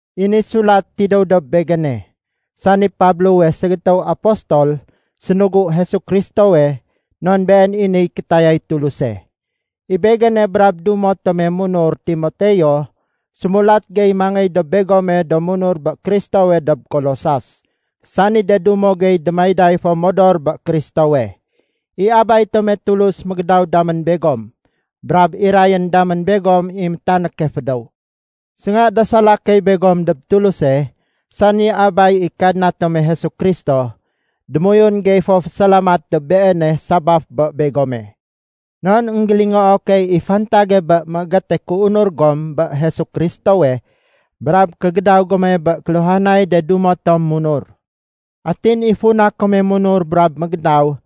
I ni sulat tidéw dob begéne, sani Pablowe ségétéw apostol sénugu Jesu Kristowe non been i niy kétayay Tuluse. I begéne brab dumo tome munur Timoteo sémulat gey mangéy dob begome do munur bé Kristowe dob Kolosas, sani de dumo gey démayday fo modor bé Kristowe. I Abay tome Tulus mégédaw damén begom brab irayén damén begom i métanéke fédéw. Sénga dasala key begom dob Tuluse, sani Abay i Kadna tome Jesu Kristo, démoyun gey fo fésalamat dob Beene sabaf bé begome. Non énggélingoo key i fantage bé méégéte kéunur gom bé Jésu Kristowe brab kégédaw gome bé kéluhanay de dumo tom munur. Atin i funa kome munur brab mégédaw,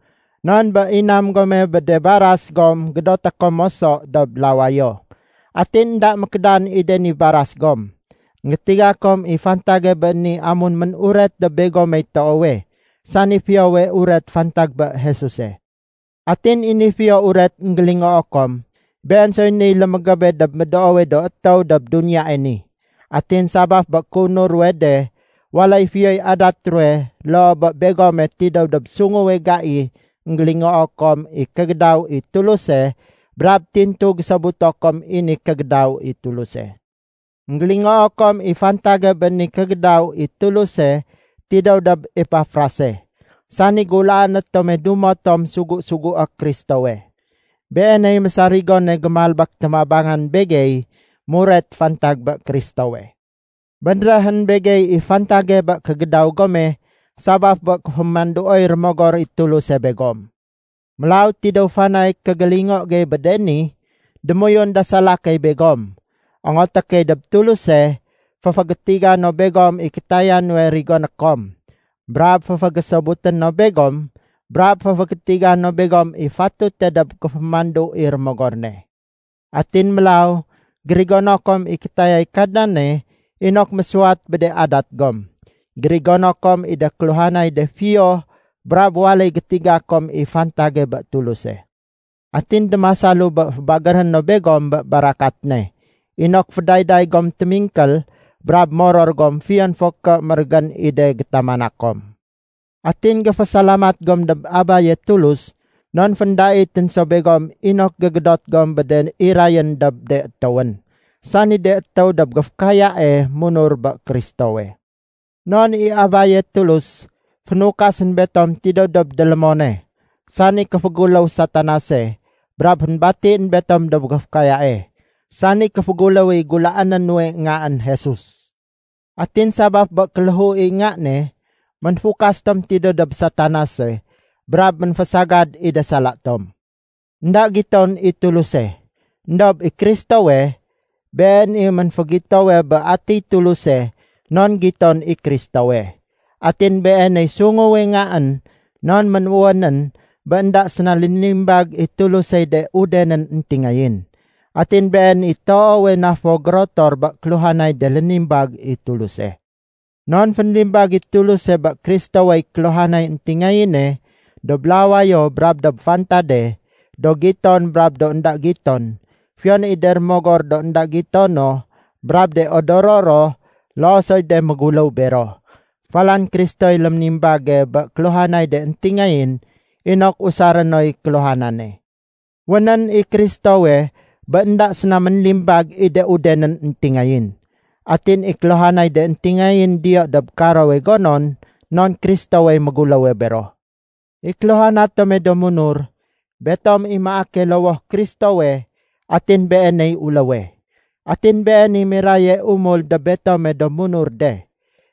non bé inam gome bé de baras gom gédoté kom moso dob lawayo. Atin énda mékédan i de ni baras gom. Enggétiga kom i fantage bé ni amun mén-uret dob begomey toowe, sani Fiyowe Uret fantag bé Jesuse. Atin i ni Fiyo Uret énggélingoo kom, been soy niy lémégébe dob médoowe do étéw dob duniyae ni. Atin sabaf bé kéunur ruwe de, waléy fiyoy adat ruwe loo bé begome tidéw dob sunguwe gai énggélingoo kom i kégédaw i Tuluse brab tintu gésobuto kom i ni kégédaw i Tuluse. Enggélingoo kom i fantage bé ni kégédaw i Tuluse tidéw dob Epafrase, sani gulaané tome dumo tom sugu-sugué Kristowe. Beeney mésarigone gémalbék témabangan begey muret fantag bé Kristowe. Bénréhén begey i fantage bé kégédaw gome sabaf bé kéfémanduoy Rémogor i Tuluse begom. Mélaw tidéw fanay kégélingo gey bé de ni, démoyun dasala key begom. Ongoté key dob Tuluse, féfégétiga no begom i kétaya nuwe rigoné kom, brab féfégésobuté no begom brab féfégétiga no begom i fatute dob kéfémandu i Rémogor ne. Atin mélaw, gérigono kom i kétayay Kadnane inok mésuwat bé de adat gom. Gérigono kom i de kéluhanay de fiyo brab waléy gétiga kom i fantage bé Tuluse. Atin démasalu bé fébagéré no begom bé barakat ne inok fédayday gom témingkél brab moror gom fiyon fo ké mérégén i de gétamana kom. Atin géfésalamat gom dob Abaye Tulus non féndaitén so begom inok gégédot gom bé de irayén dob de étéwén, sani de étéw dob géfékayae munur bé Kristowe. Non i Abaye Tulus, fénukasén betom tidéw dob délémone, sani kéféguléw Satanase brab fénbatién betom dob géfékayae, sani kéféguléw i gulaané nuwe Ngaén Jesus. Atin sabaf bé kéléhu i Nga ne, ménfukas tom tidéw dob Satanase brab ménfésagad i de sala tom. Enda giton i Tuluse, éndob i Kristowe, been i ménfégitowe bé atiy Tuluse non giton i Kristowe. Atin Beeney sunguwe Ngaén non ménwénén bé énda séna lénimbag i Tulusey de udenén éntingayén. Atin Been i toowe na fo gérotor bé kéluhanay de lénimbag i Tuluse. Non fénlimbag i Tuluse bé Kristowey kéluhanay éntingayéne, dob lawayo brab dob fantade, do giton brab de énda do giton, fiyon i de rémogor do énda gitono brab de odoro ro loo soy de méguléw bero, falan Kristoy léménimbage bé kéluhanay de éntingayén inok usaré noy kéluhanane. Wénén i Kristowe bé énda séna ménlibag i de udenén éntingayén. Atin i kéluhanay de éntingayén diyo dob karowe gonon non Kristowey méguléwe béro. I kéluhana tome do munur, betom i maake lowoh Kristowe atin Beeney uléwe. Atin Been i miraye umul dob betome do munur de.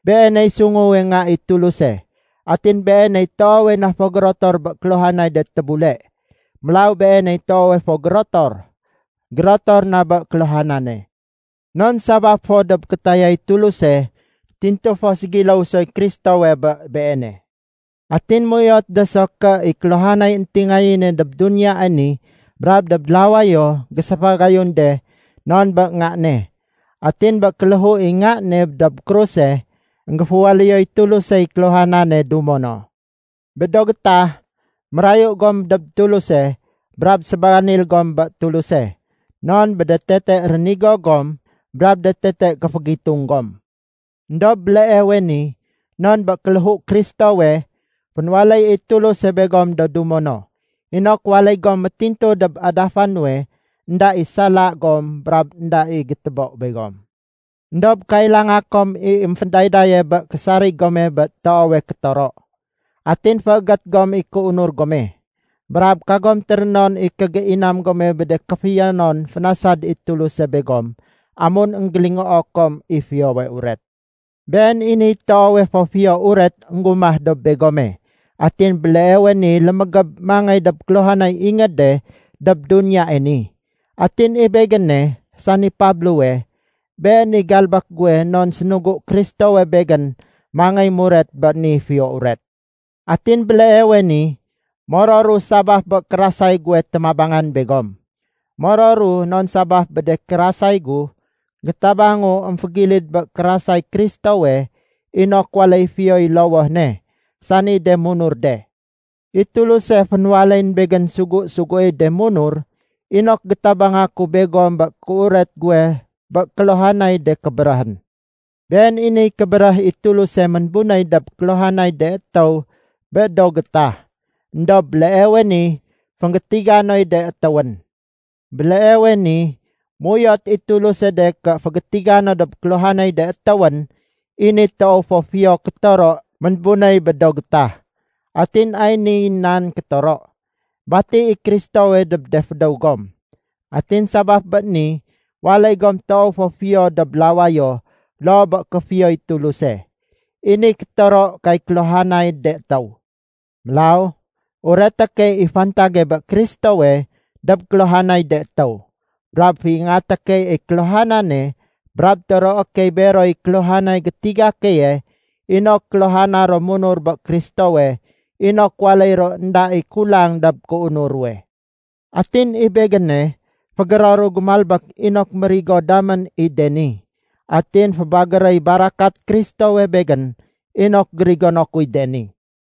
Beeney sunguwe Nga i Tuluse, atin Beeney toowe na fo gérotor bé kéluhanay de tébule. Mélaw Beeney toowe fo gérotor, gérotor na bé kéluhanane. Non sabaf fo dob kétayay Tuluse, tintu fo ségiléw soy Kristowe bé Beene. Atin méuyot de so ké i kéluhanay éntingayéne dob duniyae ni brab dob lawayo géséfagayun de non bé Nga ne. Atin bé kéléhu i Nga ne dob kruse, énggéféwaléyoy Tulusey kéluhanane dumo no. Bé do gétah, mérayu gom dob Tuluse brab sébanil gom bé Tuluse non bé de tete rénigo gom brab de tete kéfégitung gom. Endob béleewe ni non bé kéléhu Kristowe, fénwaléy i Tuluse begom do dumo no, inok waléy gom métintu dob adafa nuwe énda i sala gom brab énda i gétébo begom. Endob kailanga kom i émfédaydaye bé késarig gome bé toowe kétoro. Atin féégét gom i kéunur gome. Brab kagom térénon i kégéinam gome bé de kéfiyonon fénasad i Tuluse begom amun énggélingoo kom i Fiyowe Uret. Been i niy toowe fo Fiyo Uret énggumah dob begome atin béleewe ni lémégéb mangéy dob kéluhanay ingéde dob duniyae ni. Atin i begéne, sani Pablowe, been i galbék guwe non sénugu Kristowe begén mangéy muret bé ni Fiyo Uret. Atin béleewe ni, mororu sabaf bé kérasay guwe témabangan begom. Mororu non sabaf bé de kérasay gu, gétabangu émfégilid bé kérasay Kristowe inok waléy fiyoy lowoh ne, sani de munur de. I Tuluse fénwaléyén begén sugu-suguéy de munur inok gétabanga ku begom bé kéuret guwe bé kéluhanay de kébéréhén. Been i niy kébéréh i Tuluse ménbunéy dob kéluhanay de étéw bé do gétah. Endob béleewe ni fénggétiga noy de étéwén. Béleewe ni méuyot i Tuluse de ké fégétiga no dob kéluhanay de étéwén i ni toow fo fiyo kétoro ménbunéy bé do gétah. Atin ay niy nan kétoro: Bati i Kristowe dob de fédéw gom, atin sabaf bé ni waléy gom toow fo fiyo dob lawayo loo bé kéfiyoy Tuluse. I ni kétoro kay kéluhanay de étéw. Mélaw ureté key i fantage bé Kristowe dob kéluhanay de étéw. Brab féingaté key i kéluhanane brab toroé key beroy kéluhanay gétiga keye inok kéluhana ro munur bé Kristowe inok waléy ro énda i kulang dob kéunur ruwe. Atin i begéne fégéroru gémalbék inok mérigo damén i de ni. Atin fébagéréy barakat Kristowe begén inok gérigono kuy de ni.